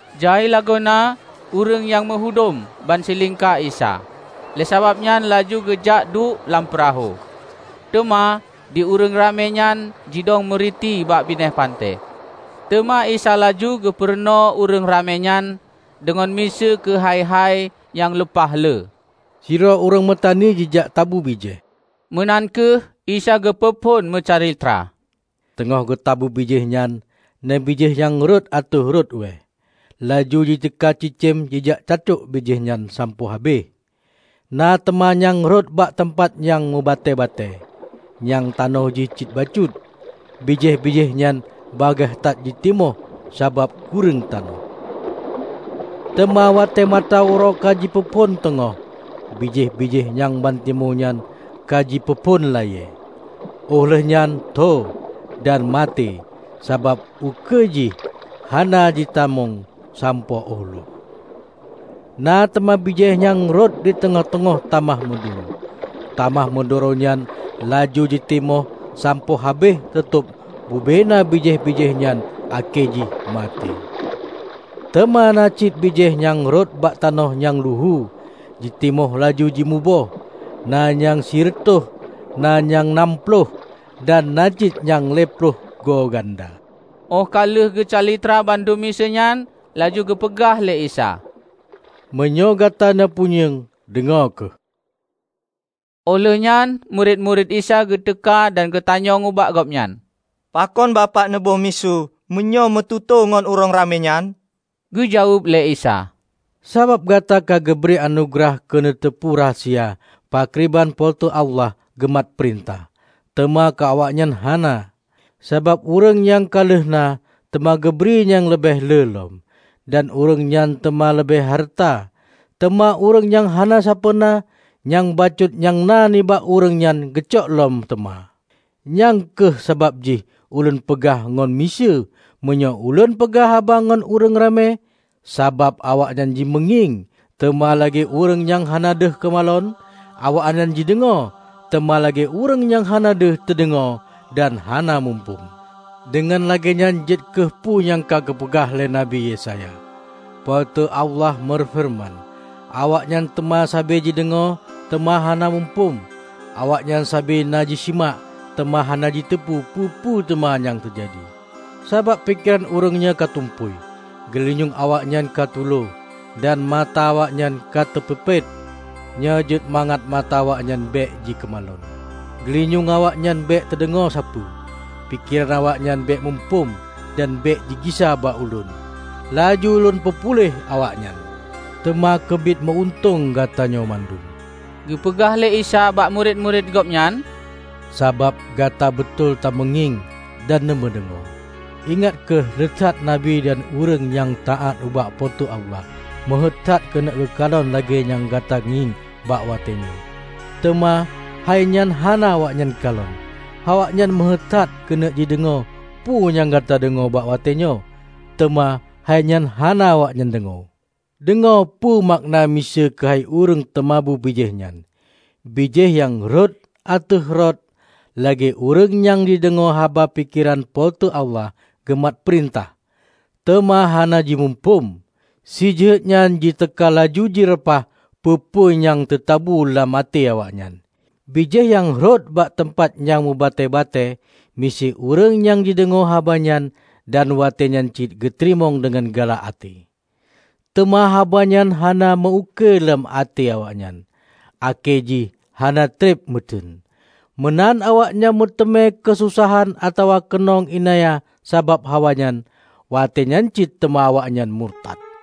Jai lagoena ureuëng nyang meuhudom ban silingka Isa, lé sabab nyan laju geujak duek lam peurahô, teuma di ureuëng ramé nyan jidong meuriti bak binéh panté. Teuma Isa laju geupeurunoe ureuëng ramé nyan deungon miseue keuhai-hai nyang lumpah lé. "Sidroe ureuëng meutani jijak tabu bijéh," meunan kheueh Isa geupeu phon meucalitra. "Teungoh geutabu bijéh nyan, na bijéh nyang rhot ateueh rot ueh. Laju jiteuka cicém jijak catuek bijéh nyan sampoe habéh. Na teuma nyang rhot bak teumpat nyang meubatée-batée, nyang tanoh jih cit bacut. Bijéh-bijéh nyan bagaih that jitimoh sabab kureueng tanoh. Teuma watée mata uroe ka jipeuphon teungoh, bijéh-bijéh nyang bantimoh nyan ka jipeuphon layée, óh lheueh nyan tho dan maté sabab ukeue jih hana jitamong sampoe óh lhok. Na teuma bijéh nyang rhot di teungoh-teungoh tamah meuduro. Tamah meuduro nyan laju jitimoh sampoe habéh teutob bubena bijéh-bijéh nyan akhé jih maté. Teuma na cit bijéh nyang rhot bak tanoh nyang luhu, jitimoh laju jimuboh; na nyang sireutôh, na nyang nam ploh, dan na cit nyang lhée ploh go ganda." Óh ka lheueh geucalitra bandum miseue nyan laju geupeugah lé Isa, "Meunyoe gata na punyueng, deungoe kheueh!" Óh lheueh nyan murit-murit Isa geuteuka dan geutanyong ubak Gobnyan, "Pakon Bapak neuboh miseue meunyoe neumeututoe ngon ureuëng ramé nyan?" Geujaweueb lé Isa, "Sabab gata ka geubri anugeurah keu neuteupeue rahsia pakriban Po teu Allah geumat peurintah, teuma keu awaknyan hana. Sabab ureuëng nyang ka lheueh na, teuma geubri nyang leubeh le lom, dan ureuëng nyan teuma leubeh hareuta. Teuma, ureuëng nyang hana sapeue na, nyang bacut nyang na nibak ureuëng nyan geucok lom teuma. Nyang kheueh sabab jih Ulôn peugah ngon miseue meunyoe Ulôn peugah haba ngon ureuëng ramé, sabab awaknyan jimeungieng, teuma lagée ureuëng nyang hana deuh keumalon; awaknyan jideungoe teuma lagée ureuëng nyang hana deuh teudeungoe dan hana muphom. Deungon lagée nyan jeuet kheueh peue nyang ka geupeugah lé Nabi Yesaya, 'Po teu Allah meufeureuman: awaknyan teuma sabe jideungoe teuma hana muphom; Awaknyan sabe na jisimak teuma hana jiteupeu peue-peue teuma nyang teujadi. Sabab pikeran ureuëng nyoe ka tumpôi, geulinyueng awaknyan ka tulo dan mata awaknyan ka teupeupét. Nyoe jeuet mangat mata awaknyan bék jikeumalon, geulinyueng awaknyan bék teudeungoe sapeue, pikeran awaknyan bék muphom dan bék jigisa bak Ulôn, laju Ulôn peupuléh awaknyan.' " "Teuma keubiet meu-untông gatanyoe bandum," geupeugah lé Isa bak murit-murit Gobnyan, "sabab gata beutôi tameungieng dan neumeudeungoe. Ingat kheueh lé that nabi dan ureuëng nyang taát ubak Po teu Allah meuhéuet that keuneuk geukalon lagée nyang gata ngieng bak watée nyoe, teuma hai nyan hana awaknyan kalon. Awaknyan meuheuét that keuneuk jideungoe peue nyang gata deungoe bak watée nyoe, teuma hai nyan hana awaknyan deungoe." "Deungoe peue makna miseue keuhai ureuëng teumabu bijéh nyan. Bijéh nyang rhot ateueh rot lagée ureuëng nyang jideungoe haba pakriban Po teu Allah geumat peurintah, teuma hana jimuphom. Si jeuhet nyan jiteuka laju jireupah peue-peue nyang teutabu lam até awaknyan. Bijéh nyang rhot bak teumpat nyang meubatée-batée, miseue ureuëng nyang jideungoe haba nyan, dan maté nyan cit geuteurimong deungon galak até. Teuma haba nyan hana meu-ukeue lam até awaknyan, akhé jih hana treb meuteuen. Meunan awaknyan meuteumé keusosahan atawa keunong iénanya sabab haba nyan, watée nyan cit teuma awaknyan murtat.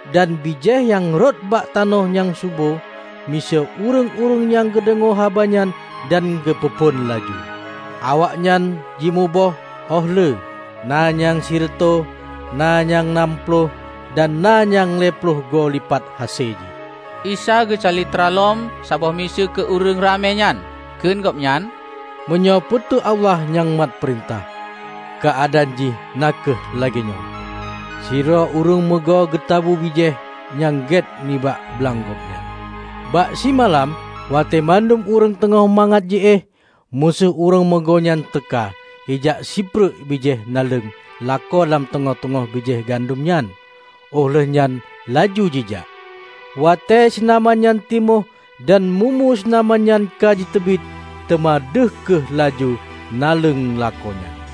Dan bijéh nyang rhot bak tanoh nyang subo miseue ureuëng-ureuëng nyang geudeungoe haba nyan dan geupeu phon laju. Awaknyan jimuboh óh lé, na nyang sireutôh, na nyang nam ploh, dan na nyang lhée ploh goe lipat hase jih." Isa geucalitra lom sabôh miseue keu ureuëng ramé nyan, kheun Gobnyan, "Meunyoe Po teu Allah nyang mat peurintah, keuadaan jih na kheueh lagée nyoe: Sidroe ureuëng meugo geutabu bijéh nyang gét nibak blang gobnyan. Bak simalam, watée bandum ureuëng teungoh mangat ji éh, musoh ureuëng meugo nyan teuka jijak sipreuk bijéh naleueng lakoe lam teungoh-teungoh bijéh gandom nyan, óh lheueh nyan laju jijak. Watée sinaman nyan timoh dan mu-mu sinaman nyan ka jiteubiet, teuma deuh kheueh laju naleueng lakoe nyan.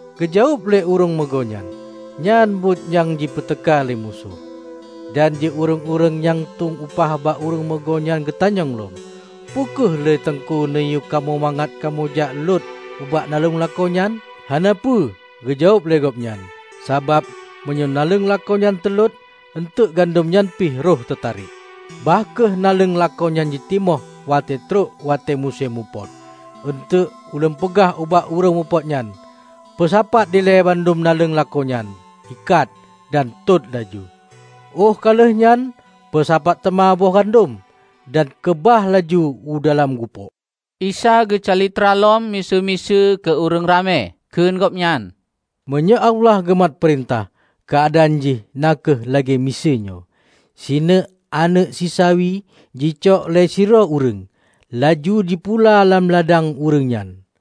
Geujaweueb lé ureuëng meugo nyan, 'Nyan buet nyang jipeuteuka lé musoh.' Dan di ureuëng-ureuëng nyang tueng upah ubak ureuëng meugo nyan geutanyong lom, 'Peu kheueh lé Teungku neuyue kamoe mangat kamoe jak lot bak naleueng lakoe nyan?' 'Hana peue,' geujaweueb lé gobnyan, 'Sabab meunyoe naleueng lakoe nyan teulot, eunteuk gandom nyan pih rhoh teutarek. Bah kheueh naleueng lakoe nyan jitimoh watée trok watée musém mupot. Eunteuk ulôn peugah ubak ureuëng mupot nyan: Peusapat dilée bandum naleueng lakoe nyan, ikat, dan tot laju. Óh ka lheueh nyan peusapat teuma boh gandom, dan keubah laju u dalam gupôk.' " Isa geucalitra lom miseue-miseue keu ureuëng ramé, kheun Gobnyan, "Meunyoe Allah geumat peurintah, keuadaan jih na kheueh lagée miseue nyoe: sineuk aneuëk sisawi jicok lé sidroe ureuëng, laju jipula lam ladang ureuëng nyan.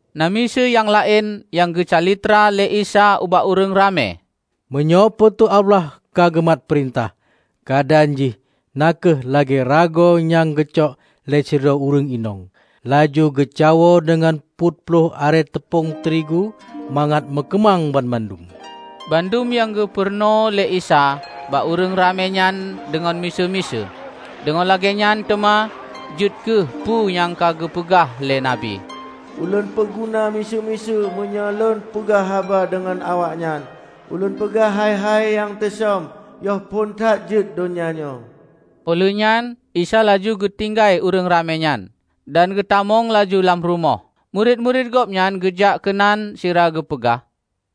Na miseue nyang laén nyang geucalitra lé Isa ubak ureuëng ramé, "Meunyoe Po teu Allah ka geumat peurintah, keuadaan jih na kheueh lagée ragoe nyang geucok lé sidroe ureuëng inong, laju geucawoe deungon peuet ploh arée teupông teurigu mangat meukeumang banmandum!" Bandum nyang geupurunoe lé Isa bak ureuëng ramé nyan deungon miseue-miseue. Deungon lagée nyan teuma jeuet kheueh peue nyang ka geupeugah lé nabi, 'Ulôn peuguna miseue-miseue meunyoe Lôn peugah haba deungon awaknyan; ulôn peugah hai-hai nyang teusöm yoh phon that jeuet donya nyoe." Óh lheueh nyan Isa laju geutinggai ureuëng ramé nyan, dan geutamong laju lam rumoh. Murit-murit Gobnyan geujak keunan sira geupeugah,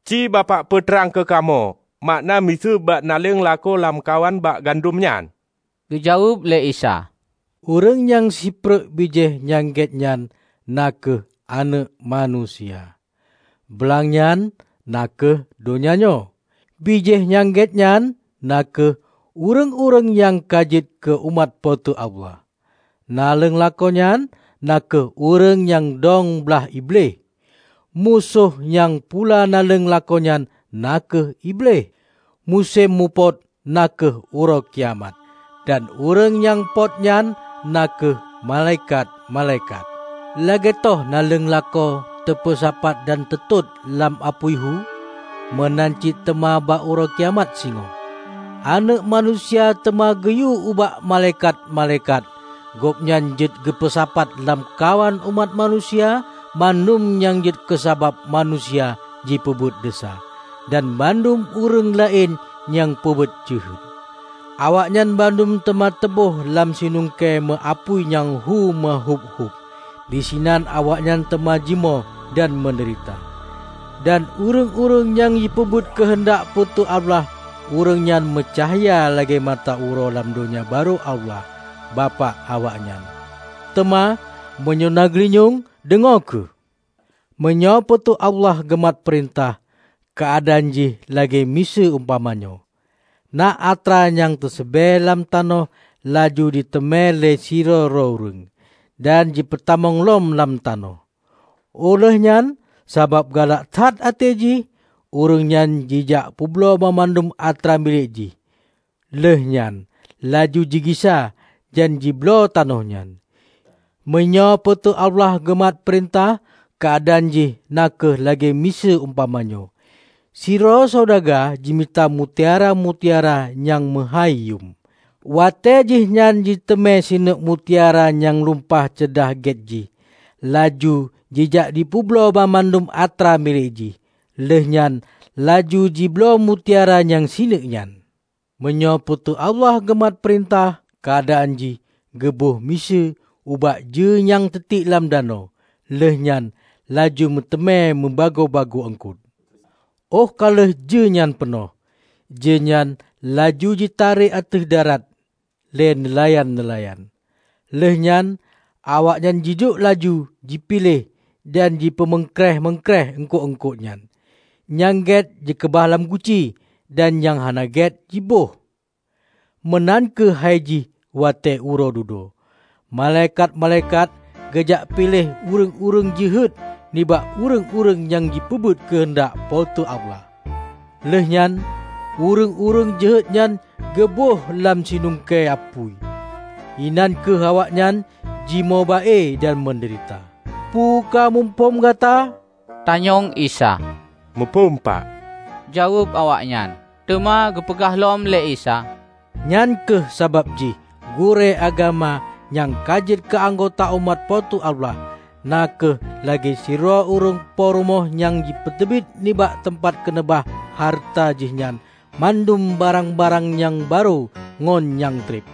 "Ci Bapak peutrang keu kamoe makna miseue bak naleueng lakoe lamkawan bak gandom nyan." Geujaweueb lé Isa, "Ureuëng nyang sipreuk bijéh nyang gét nyan na kheueh Aneuëk Manusia. Blang nyan na kheueh donya nyoe. Bijéh nyang gét nyan na kheueh ureuëng-ureuëng nyang ka jeuet keu umat Po teu Allah. Naleueng lakoe nyan na kheueh ureuëng nyang doeng blaih Iblih. Musoh nyang pula naleueng lakoe nyan na kheueh Iblih. Musém mupot na kheueh Uroe Kiamat, dan ureuëng nyang pot nyan na kheueh malaikat-malaikat. Lagée toh naleueng lakoe teupeusapat dan teutot lam apui hu, meunan cit teuma bak Uroe Kiamat singoh. Aneuëk Manusia teuma geuyue ubak malaikat-malaikat Gobnyan jeuet geupeusapat lamkawan umat manusia bandum nyang jeuet keusabab manusia jipeubuet desya, dan bandum ureuëng laén nyang peubuet jeuhet. Awaknyan bandum teuma teuböh lam sinungkée meu-apui nyang hu meuhuéb-huéb; disinan awaknyan teuma jimoe dan meudeurita. Dan ureuëng-ureuëng nyang jipeubuet keuheundak Po teu Allah ureuëng nyan meucahya lagée mata uroe lam Donya Barô Allah, Bapak awaknyan. Teuma, meunyoe na geulinyueng, deungoe kheueh!" "Meunyoe Po teu Allah geumat peurintah, keuadaan jih lagée miseue umpamanyoe: Na atra nyang teuseubée lam tanoh laju jiteumé lé sidroe-droe ureuëng, dan jipeutamong lom lam tanoh. Oh lheueh nyan sabab galak that até jih, ureuëngnyan jijak peubloe banmandum atra milék jih, lheuehnyan laju jigisa dan jibloe tanoh nyan." "Meunyoe Po teu Allah geumat peurintah, keuadaan jih na kheueh lagée miseue umpamanyoe: Sidroe saudaga jimita mutiara-mutiara nyang meuhái yum. Watée jihnyan jiteumé sineuk mutiara nyang lumpah ceudah get jih, laju jijak jipeubloe banmandum atra milék jih, lheuehnyan laju jibloe mutiara nyang sineuk nyan." "Meunyoe Po teu Allah geumat peurintah, keuadaan jih geuboh miseue ubak jeue nyang teutiek lam danau, lheueh nyan laju meuteumé meubagoe-bagoe eungkot. Oh ka lheueh jeue nyan peunoh, jeue nyan laju jitarek ateueh darat lé neulayan-neulayan. Lheuehnyan awaknyan jiduek laju jipiléh dan jipeumeungkréeh-meungkréeh eungkot-eungkotnyan: Nyang get jikeubah lam guci dan nyang hana get jiböih. Meunan kheueh haijih watée Uroe Dudoe, malaikat-malaikat geujak piléh ureuëng-ureuëng jeuhet nibak ureuëng-ureuëng nyang jipeubuet keuheundak Po teu Allah. Lheuehnyan ureuëng-ureuëng jeuhetnyan geuböih lam sinungkée apui. Inan kheueh awaknyan jimoe ba-e dan meudeurita." "Peue ka muphom gata?" tanyong Isa, "Muphom Pak!" jaweueb awaknyan. Teuma geupeugah lom lé Isa, "Nyan kheueh sabab jih gurée agama nyang ka jeuet keu anggota umat Po Teu Allah, na kheueh lagée sidroe ureuëng po rumoh nyang jipeuteubiet nibak teumpat keuneubah hareuta jihnyan bandum barang-barang nyang barô ngon nyang treb."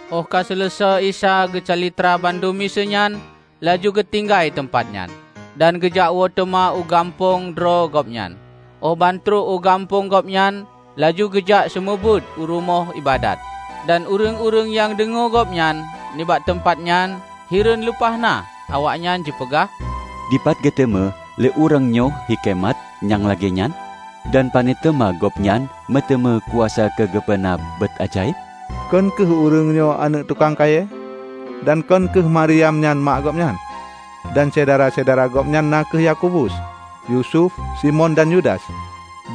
Óh ka seuleusoe Isa geucalitra bandum miseue nyan, laju geutinggai teumpat nyan, dan geujakwoe teuma u gampông droe Gobnyan. Óh bantrok u gampông Gobnyan laju geujak seumeubeuet u rumoh iébadat, dan ureuëng-ureuëng nyang deungoe Gobnyan nibak teumpat nyan, hireuen lumpah na. Awaknyan jipeugah, "Dipat geuteumé lé ureuëng nyoe hikeumat nyang lagée nyan? Dan pane teuma Gobnyan meuteumé kuasa keu geupeuna buet ajaéb? Kon kheueh ureuëng nyoe aneuëk tukang kayée? Dan kon kheueh Mariam nyan mak Gobnyan; dan syedara-syedara Gobnyan na kheueh Yakobus, Yusuf, Simon dan Yudas?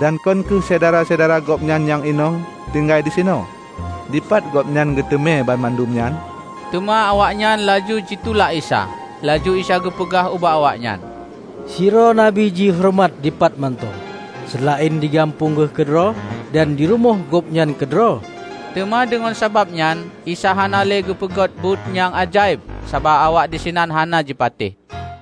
Dan kon kheueh syedara-syedara Gobnyan nyang inong tinggai disinoe? Dipat Gobnyan geuteumé banmandum nyan?" Teuma awaknyan laju jitulak Isa. Laju Isa geupeugah ubak awaknyan, "Sidroe nabi jihoreumat dipat mantong, seulaén di gampông geuh keudroe dan di rumoh gobnyan keudroe." Teuma deungon sabab nyan Isa hana lé geupeugöt buet nyang ajaéb sabab awak disinan hana jipatéh.